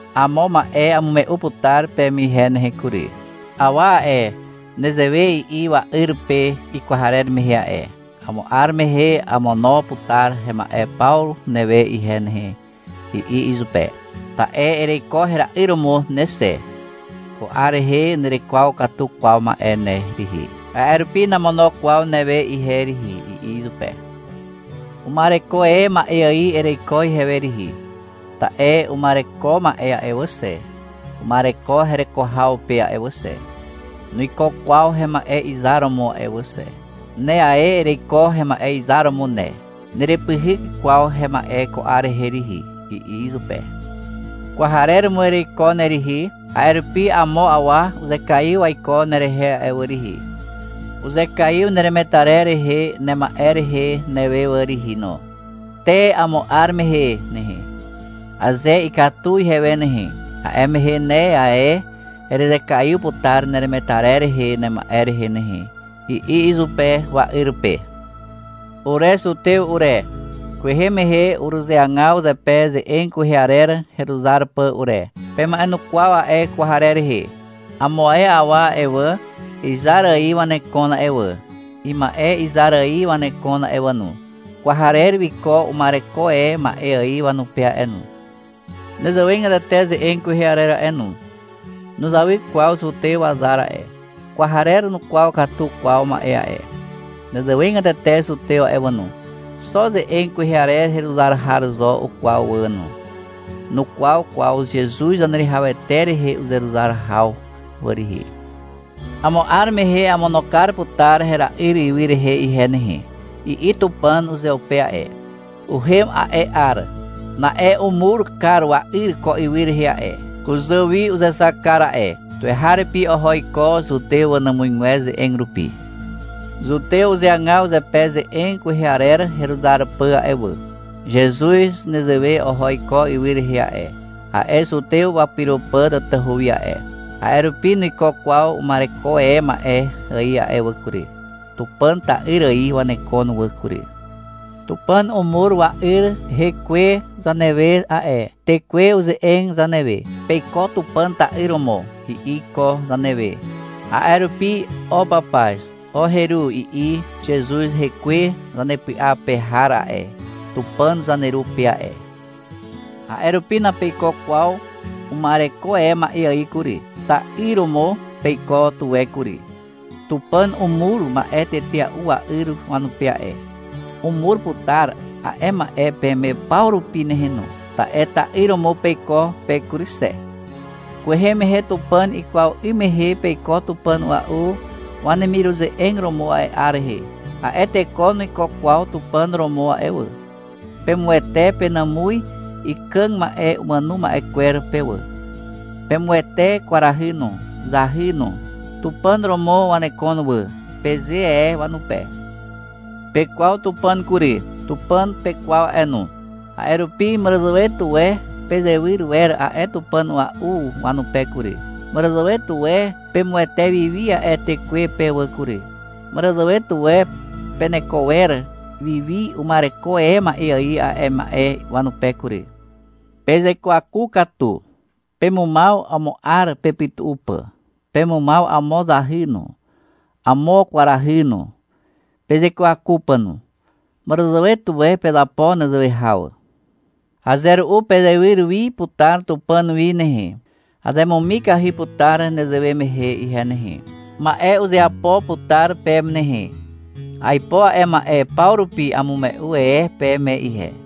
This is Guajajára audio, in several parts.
Amo ma'e amume'u putar peme ihe nehe kury. Awa a'e, nezewe i'i wa'yr pe ikwarer mehe a'e. — Amo 'ar mehe amono putar hema'e paw newe ihe nehe, i'i izupe. — Ta'e ereiko hera'yr romo ne xe. Ko 'ar rehe nerekwaw katu kwaw ma'e ne rihi, a'e rupi namono kwaw newe ihe rihi, i'i izupe. — Uma'ereko e ma'e ài ereiko ihewe rihi. Ta'e uma'ereko ma'e a'e wà xe, uma'ereko hereko haw pe a'e wà xe. Nuiko kwaw hema'e izar romo a'e wà xe. Ne ae ereiko hema'e izar romo ne. Nerepyhyk kwaw hema'e ko 'ar rehe rihi, i'i izupe. — Kwarer romo ereiko ne rihi, a'e rupi amo awa uzekaiw waiko nerehe a'e wà rihi. Uzekaiw neremetarer rehe nema'e rehe newe wà rihi no. Te amo 'ar mehe nehe, aze ikatu ihewe nehe, a'e mehe ne ae erezekaiw putar neremetarer rehe nema'e rehe nehe, i'i izupe wa'yr pe. Ure zutew ure, kwehe mehe uruzeagaw zepe ze'eg kwehe arer heruzar pà ure. Pema'enukwaw a'e kwarer rehe. Amo ae awa a'e wà, izar ài wanekon a'e wà, ima'e izar ài wanekon a'e wà no. Kwarer wiko uma'ereko e ma'e ài wanupe a'e no. Nezewegatete ze'eg kwehe arer a'e no. Nuzawy kwaw zutew wazar a'e. Kwarer nukwaw katu kwaw ma'e a'e. Nezewegatete zutew wà no, xo ze'eg kwehe arer heruzar haw zo ukwaw wà no. Nukwaw kwaw Zezuz Zaneruwihawete rehe uzeruzar haw wà rihi. — Amo 'ar mehe amono kar putar hera'yr ywy rehe ihe nehe, i'i Tupàn uzeupe a'e. Uhem a'e 'ar. Na'e umur kar wa'yr ko ywy rehe a'e. Kuzà wi uzexak kar a'e. Tuweharupi oho iko zutew wanàmuzgwer ze'eg rupi. Zutew uzeagaw zepe ze'eg kwehe arer heruzar pà a'e wà. Zezuz nezewe oho iko ywy rehe a'e, a'e zutew wapyro pà tatahu wi a'e. A'e rupi nuiko kwaw uma'ereko e ma'e ài a'e wà kury. Tupàn ta'yr ài wanekon wà kury. Tupàn umur wa'yr hekwe zanewe a'e. Tekwe uze'eg zanewe. — Peiko Tupàn ta'yr romo, i'i iko zanewe. A'e rupi — O papaz, o heru, i'i Zezuz hekwe zanepy'a pe har a'e, Tupàn zaneru pe a'e. A'e rupi napeiko kwaw uma'ereko e ma'e ài kury. Ta'yr romo peiko tuwe kury. Tupàn umur ma'e tetea'u wa'yr wanupe a'e. Umur putar a'e ma'e peme paw rupi nehe no, ta'e ta'yr romo peiko pe kury xe. Kwehe mehe Tupàn ikwaw 'ym mehe peiko tupàn a'ua'u wanemiruze'eg romo a'e 'ar rehe. A'e teko nuiko kwaw Tupàn romo a'e wà. (Pemuwete penàmuz ikàg ma'e umàno ma'e kwer pe wà. Pemuwete kwarahy no, zahy no. — Tupàn romo wanekon wà, peze e wanupe.) Pekwaw Tupàn kury. Tupàn pekwaw a'e no. A'e rupi màràzàwe tuwe pezewyr wer a'e tupàn a'ua'u wanupe kury. Màràzàwe tuwe pemuwete wi wi a'e tekwe pe wà kury. Màràzàwe tuwe peneko wer wi wi uma'ereko e ma'e ài a'e ma'e wanupe kury. Pezekwaku katu. Pemumaw amo 'ar pepytu'u pà. Pemumaw amo zahy no, amo kwarahy no, pezekwaku pà no. Màràzàwe tuwe pezapo nezewe haw. Aze ru'u pezewyr wi putar Tupàn wi nehe. Azemumikahy putar nezewe mehe ihe nehe. Ma'e uzeapo putar peme nehe. Aipo a'e ma'e paw rupi amume'u e peme ihe.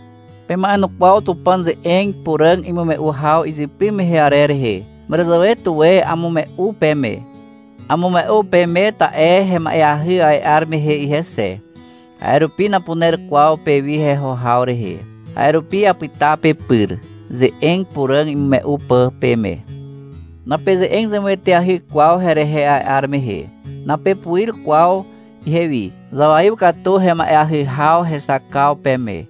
Pema'enukwaw Tupàn ze'eg puràg imume'u haw izypy mehe arer rehe. Màràzàwe tuwe amume'u peme. Amume'u peme, ta'e hema'eahy a'e 'ar mehe ihe xe. (A'e rupi napuner kwaw pewi heho haw rehe. A'e rupi apyta pepyr, ze'eg puràg imume'u pà peme.) Napeze'eg zemueteahy kwaw herehe a'e 'ar mehe. Napepuir kwaw ihewi. Zawaiw katu hema'eahy haw hexakaw peme.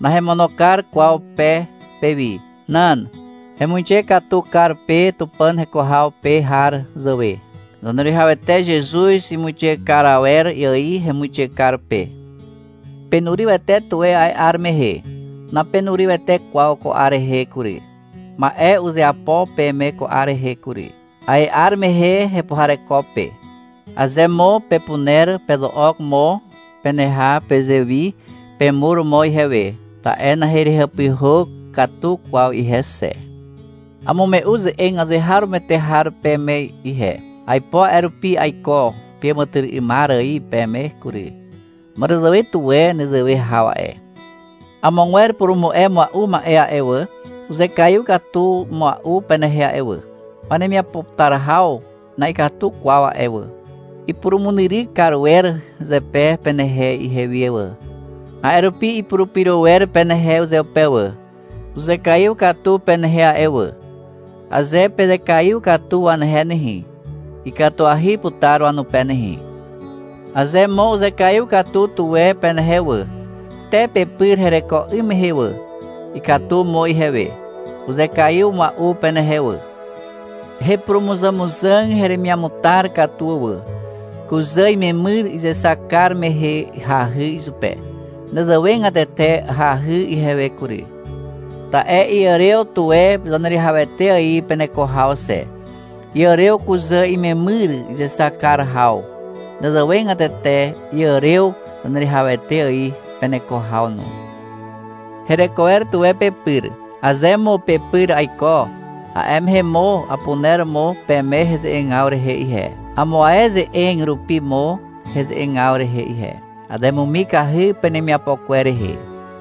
Nahemono kar kwaw pe pewi. Nan. Hemuixe katu kar pe Tupàn heko haw pe har zàwe. Zaneruwihawete Zezuz imuixe kar awer ài hemuixe kar pe. Penurywete tuwe a'e 'ar mehe. Napenurywete kwaw ko 'ar rehe kury. Ma'e uzeapo peme ko 'ar rehe kury. A'e 'ar mehe hepuhareko pe. Aze mo pepuner, pezo'ok mo peneha pezewi, pemur mo ihewe, (ta'e naherehàpyhà katu kwaw ihe xe). Amume'u ze'eg azeharomoete har peme ihe. Aipo a'e rupi aiko peàmàtyry'ymar ài peme kury. Màràzàwe tuwe nezewe haw a'e. Amogwer purumu'e mua'u ma'e a'e wà, uzekaiw katu mua'u penehe a'e wà. Wanemiapo putar haw na'ikatu kwaw a'e wà. Ipurumunyryk kar wer zepe penehe ihewi wà. A'e rupi ipurupyro wer penehe uzeupe wà. Uzekaiw katu penehe a'e wà. Aze pezekaiw katu wanehe nehe, ikatuahy putar wanupe nehe. Aze mo uzekaiw katu tuwe penehe wà, te pepyr hereko 'ym mehe wà, ikatu mo ihewe. Uzekaiw mua'u penehe wà. Hepurumuzàmuzàg heremiamutar katu wà. Kuzà imemyr izexak kar mehe hahy izupe. Nezewegatete hahy ihewe kury, ta'e iàrew tuwe Zaneruwihawete ài peneko haw xe. Iàrew kuzà imemyr izexak kar haw. Nezewegatete iàrew Zaneruwihawete ài peneko haw no. Hereko wer tuwe pepyr. Aze mo pepyr aiko, a'e mehe mo apuner mo peme heze'egaw rehe ihe, amo ae ze'eg rupi mo heze'egaw rehe ihe. Azemumikahy penemiapo kwer rehe.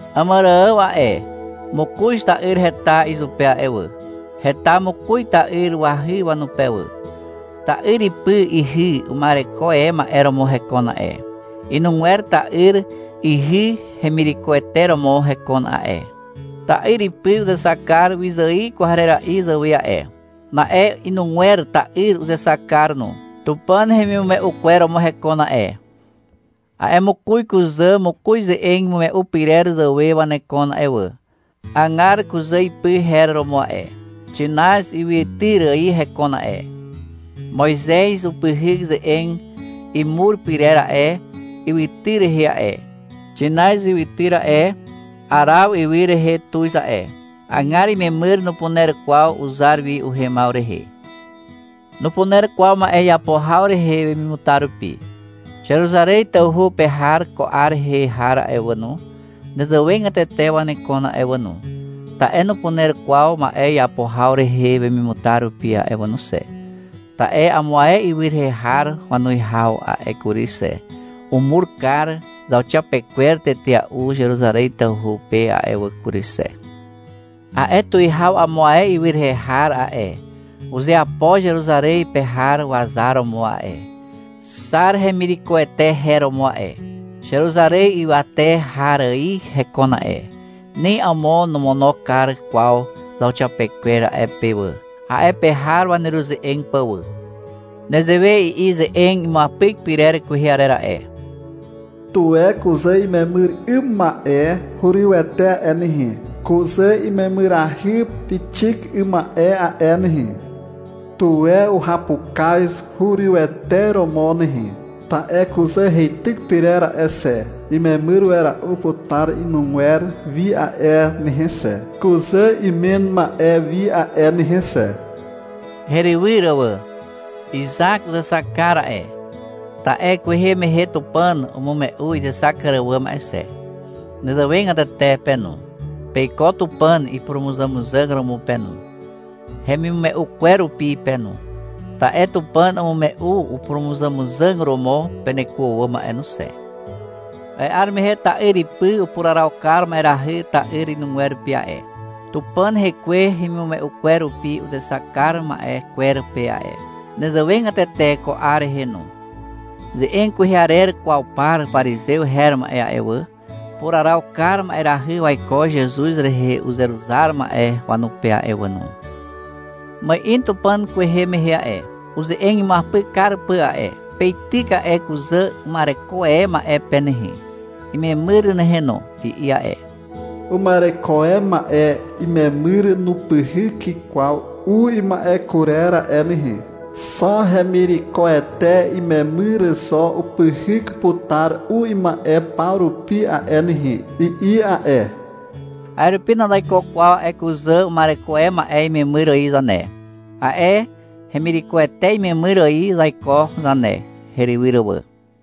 Àmàrààw a'e, mokoz ta'yr heta izupe a'e wà. Heta mokoz ta'yr wahy wanupe wà. Ta'yr ipy ihy uma'ereko e ma'e romo hekon a'e. Inugwer ta'yr ihy hemirekoete romo hekon a'e. Ta'yr ipy uzexak kar wyzài kwarera'i zàwe a'e. Na'e inugwer ta'yr uzexak kar no. Tupàn hemimume'u kwer romo hekon a'e. A'e mokoz kuzà mokoz ze'eg imume'u pyrer zàwe wanekon a'e wà. — Agar, kuzà ipy her romo a'e. Xinaz ywytyr ài hekon a'e, Moizez upyhyk ze'eg imur pyrer a'e ywytyr rehe a'e. (Xinaz ywytyr a'e, Araw ywy rehe tuz a'e.) Agar imemyr nupuner kwaw uzar wi uhemaw rehe. Nupuner kwaw ma'e iapo haw rehe wemimutar rupi. Zeruzarez tawhu pe har ko 'ar rehe har a'e wà no, nezewegatete wanekon a'e wà no, ta'e nupuner kwaw ma'e iapo haw rehe wemimutar rupi a'e wà no xe, ta'e amo ae ywy rehe har wanuwihaw a'e kury xe, umur kar zauxiapekwer tetea'u Zeruzarez tawhu pe a'e wà kury xe. A'e tuwihaw amo ae ywy rehe har a'e, uzeapo Zeruzarez pe har wazar romo a'e. — Xar, hemirekoete her romo a'e. Zeruzarez ywate har ài hekon a'e. Ni amo nomono kar kwaw zauxiapekwer a'e pe wà, a'e pe har waneruze'eg pà wà. Nezewe i'i ze'eg imuapyk pyrer kwehe arer a'e. Tuwe kuzà imemyr 'ym ma'e hurywete a'e nehe, Kuzà imemyrahy pixik 'ym ma'e a'e nehe. Tuwe uhapukaz hurywete romo nehe. Ta'e kuzà heityk pyrer a'e xe, Imemyr wera'u putar inugwer wi a'e nehe xe, Kuzà imen ma'e wi a'e nehe xe, Herywyr wà. Izak uzexak kar a'e, ta'e kwehe mehe Tupàn umume'u izexak kar àwàm a'e xe. Nezewegatete pe no, peiko Tupàn ipurumuzàmuzàg romo pe no, hemimume'u kwer rupi pe no, ta'e Tupàn umume'u upurumuzàmuzàg romo peneko àwàm a'e no xe. A'e 'ar mehe ta'yr ipy upuraraw kar ma'erahy ta'yr inugwer pe a'e, Tupàn Hekwe hemimume'u kwer rupi uzexak kar ma'e kwer pe a'e. Nezewegatete ko 'ar rehe no. Ze'eg kwehe arer kwaw par parizew her ma'e a'e wà, upuraraw kar ma'erahy waiko Zezuz rehe uzeruzar ma'e wanupe a'e wà no. Ma'in Tupàn kwehe mehe a'e, uze'eg imuapyk kar pà a'e. — Peityk a'e kuzà uma'ereko e ma'e pe nehe, imemyr nehe no, i'i a'e. — Uma'ereko e ma'e imemyr nupyhyk kwaw u ima'e kurer a'e nehe. Xo hemirekoete imemyr zo upyhyk putar u ima'e paw rupi a'e nehe, i'i a'e. A'e rupi nazaiko kwaw a'e kuzà uma'ereko e ma'e imemyr ài zane. A'e hemirekoete imemyr ài zaiko zane, herywyr wà.